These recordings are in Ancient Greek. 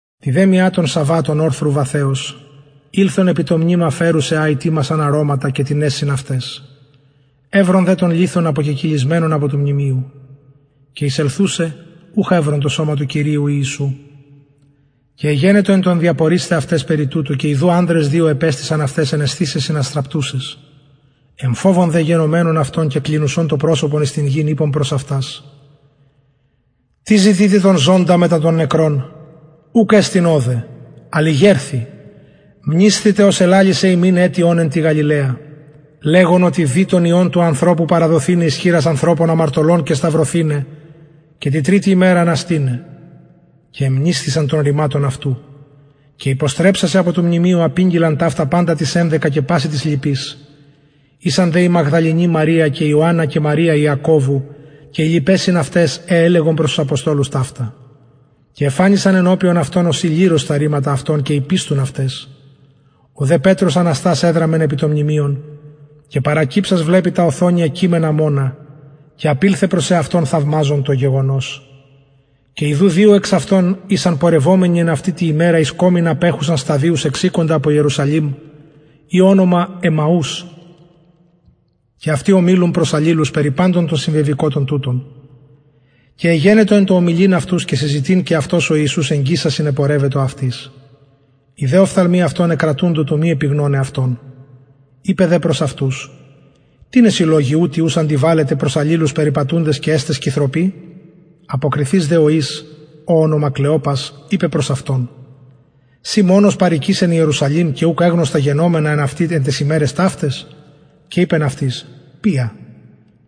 τη δε μια των σαββατων ορθρου βαθεος ηλθον επι το μνημα φερουσαι α ητοιμασαν αρωματα και τινες συν αυταις ευρον δε τον λιθον αποκεκυλισμενον απο του μνημειου και εισελθουσαι ουχ ευρον το σωμα του κυριου ιησου και εγενετο εν τω διαπορεισθαι αυτας περι τουτου και ιδου ανδρες δυο επεστησαν αυταις εν εσθησεσιν αστραπτουσαις εμφοβων δε γενομενων αυτων και κλινουσων το προσωπον εις την γην ειπον προς αυτας τι ζητειτε τον ζωντα μετα των νεκρων ουκ εστιν ωδε αλλ ηγερθη μνησθητε ως ελαλησεν υμιν ετι ων εν τη γαλιλαια λεγων οτι δει τον υιον του ανθρωπου παραδοθηναι εις χειρας ανθρωπων αμαρτωλων και σταυρωθηναι και τη τριτη ημερα αναστηναι και εμνησθησαν των ρηματων αυτου και υποστρεψασαι απο του μνημειου απηγγειλαν ταυτα παντα τοις ενδεκα και πασιν τοις λοιποις ησαν δε η μαγδαληνη μαρια και ιωαννα και μαρια ιακωβου και αι λοιπαι συν αυταις αι ελεγον προς τους αποστολους ταυτα και εφανησαν ενωπιον αυτων ωσει ληρος τα ρηματα αυτων και ηπιστουν αυταις ο δε πετρος αναστας εδραμεν επι το μνημειον και παρακυψας βλεπει τα οθονια κειμενα μονα και απηλθεν προς εαυτον θαυμαζων το γεγονος και ιδου δυο εξ αυτων ησαν πορευομενοι εν αυτη τη ημερα εις κωμην απεχουσαν σταδιους εξηκοντα απο ιερουσαλημ η ονομα εμμαους και αυτοι ωμιλουν προς αλληλους περι παντων των συμβεβηκοτων τουτων και εγενετο εν τω ομιλειν αυτους και συζητειν και αυτος ο ιησους εγγισας συνεπορευετο αυτοις οι δε οφθαλμοι αυτων εκρατουντο του μη επιγνωναι αυτον ειπεν δε προς αυτους τινες οι λογοι ουτοι ους αντιβαλλετε προς αλληλους περιπατουντες και εστε σκυθρωποι αποκριθεις δε ο εις ω ονομα κλεοπας ειπεν προς αυτον συ μονος παροικεις ιερουσαλημ και ουκ εγνως τα γενομενα εν αυτη εν ταις ημεραις ταυταις και ειπεν αυτοις ποια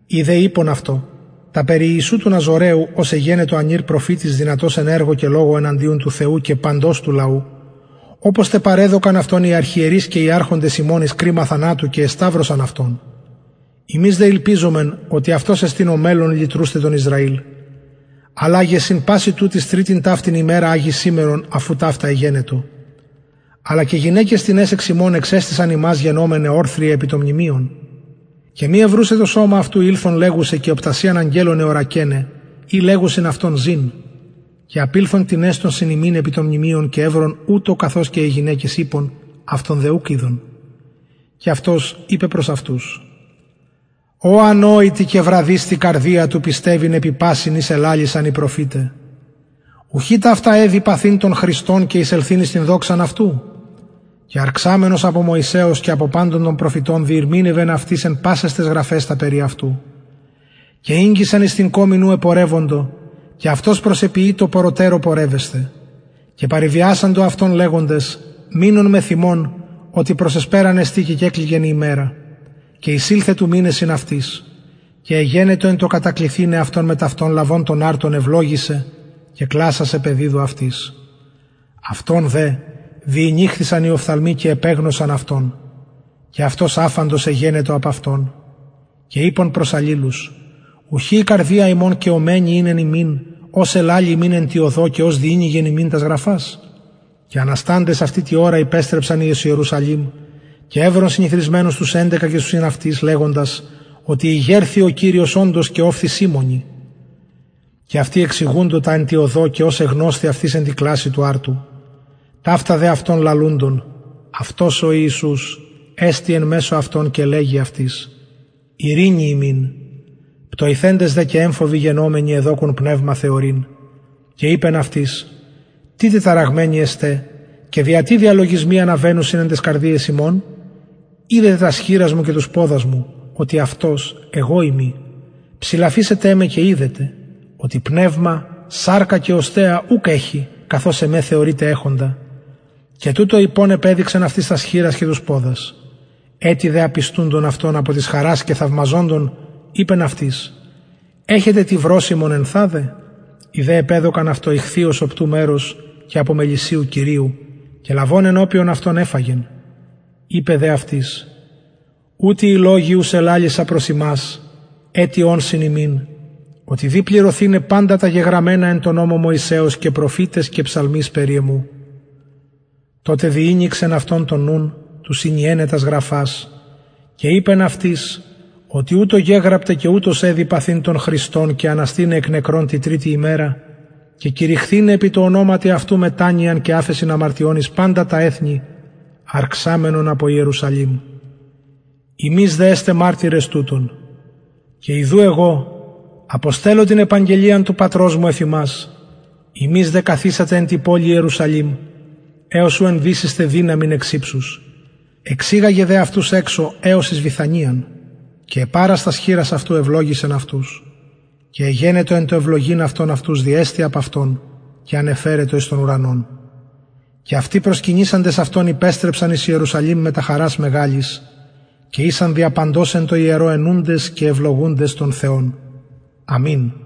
οι δε ειπον αυτω τα περι ιησου του ναζωραιου ος εγενετο ανηρ προφητης δυνατος εν εργω και λογω εναντιον του θεου και παντος του λαου οπως τε παρεδωκαν αυτον οι αρχιερεις και οι αρχοντες ημων εις κριμα θανατου και εσταυρωσαν αυτον ημεις δε ηλπιζομεν οτι αυτος εστιν ο μελλων λυτρουσθαι τον ισραηλ αλλα γε συν πασιν τουτοις τριτην ταυτην ημεραν αγει σημερον αφ ου ταυτα εγενετο αλλα και γυναικες τινες εξ ημων εξεστησαν ημας γενομεναι ορθριαι επι το μνημειον και μη ευρουσαι το σωμα αυτου ηλθον λεγουσαι και οπτασιαν αγγελων εωρακεναι οι λεγουσιν αυτον ζην και απηλθον τινες των συν ημιν επι το μνημειον και ευρον ουτως καθως και αι γυναικες ειπον αυτον δε ουκ ειδον και αυτος ειπεν προς αυτους ω ανοητοι και βραδεις τη καρδια του πιστευειν επι πασιν οις ελαλησαν οι προφηται ουχι ταυτα εδει παθειν τον χριστον και εισελθειν εις την δοξαν αυτου και αρξαμενος απο μωσεως και απο παντων των προφητων διηρμηνευεν αυτοις εν πασαις ταις γραφαις τα περι εαυτου και ηγγισαν εις την κωμην ου επορευοντο και αυτος προσεποιειτο πορρωτερω πορευεσθαι και παρεβιασαντο αυτον λεγοντες μεινον μεθ ημων οτι προς εσπεραν εστιν και κεκλικεν η ημερα και εισηλθεν του μειναι συν αυτοις και εγενετο εν τω κατακλιθηναι αυτον μετ αυτων λαβων τον αρτον ευλογησεν και κλασας επεδιδου αυτοις αυτων δε διηνοιχθησαν οι οφθαλμοι και επεγνωσαν αυτον και αυτος αφαντος εγενετο απ αυτων και ειπον προς αλληλους ουχι η καρδια ημων καιομενη ην εν ημιν ως ελαλει ημιν εν τη οδω και ως διηνοιγεν ημιν τας γραφας και ανασταντες αυτη τη ωρα υπεστρεψαν εις ιερουσαλημ και ευρον συνηθροισμενους τους ενδεκα και τους συν αυτοις λεγοντας οτι ηγερθη ο κυριος οντως και ωφθη σιμωνι και αυτοι εξηγουντο τα εν τη οδω και ως εγνωσθη αυτοις εν τη κλασει του αρτου ταυτα δε αυτων λαλουντων αυτος ο ιησους εστη εν μεσω αυτων και λεγει αυτοις ειρηνη υμιν πτοηθεντες δε και εμφοβοι γενομενοι εδοκουν πνευμα θεωρειν και ειπεν αυτοις τι τεταραγμενοι εστε και δια τι διαλογισμοι αναβαινουσιν εν ταις καρδιαις υμων ιδετε τας χειρας μου και τους ποδας μου οτι αυτος εγω ειμι ψηλαφησατε με και ιδετε οτι πνευμα σαρκα και οστεα ουκ εχει καθως εμε θεωρειτε εχοντα και τουτο ειπων επεδειξεν αυτοις τας χειρας και τους ποδας ετι δε απιστουντων αυτων απο της χαρας και θαυμαζοντων ειπεν αυτοις εχετε τι βρωσιμον ενθαδε οι δε επεδωκαν αυτω ιχθυος οπτου μερος και απο μελισσιου κηριου και λαβων ενωπιον αυτων εφαγεν ειπεν δε αυτοις ουτοι οι λογοι ους ελαλησα προς υμας ετι ων συν υμιν οτι δει πληρωθηναι παντα τα γεγραμμενα εν τω νομω μωσεως και προφηταις και ψαλμοις περι εμου τοτε διηνοιξεν αυτων τον νουν του συνιεναι τας γραφας και ειπεν αυτοις οτι ουτως γεγραπται και ουτως εδει παθειν τον χριστον και αναστηναι εκ νεκρων τη τριτη ημερα και κηρυχθηναι επι τω ονοματι αυτου μετανοιαν και αφεσιν αμαρτιων εις παντα τα εθνη αρξαμενον απο ιερουσαλημ υμεις δε εστε μαρτυρες τουτων και ιδου εγω αποστελλω την επαγγελιαν του πατρος μου εφ υμας υμεις δε καθισατε εν τη πολει ιερουσαλημ εως ου ενδυσησθε δυναμιν εξ υψους εξηγαγεν δε αυτους εξω εως εις βηθανιαν και επαρας τας χειρας αυτου ευλογησεν αυτους και εγενετο εν τω ευλογειν αυτον αυτους διεστη απ αυτων και ανεφερετο εις τον ουρανον και αυτοι προσκυνησαντες αυτον υπεστρεψαν εις ιερουσαλημ μετα χαρας μεγαλης και ησαν δια παντος εν τω ιερω αινουντες και ευλογουντες τον θεον αμην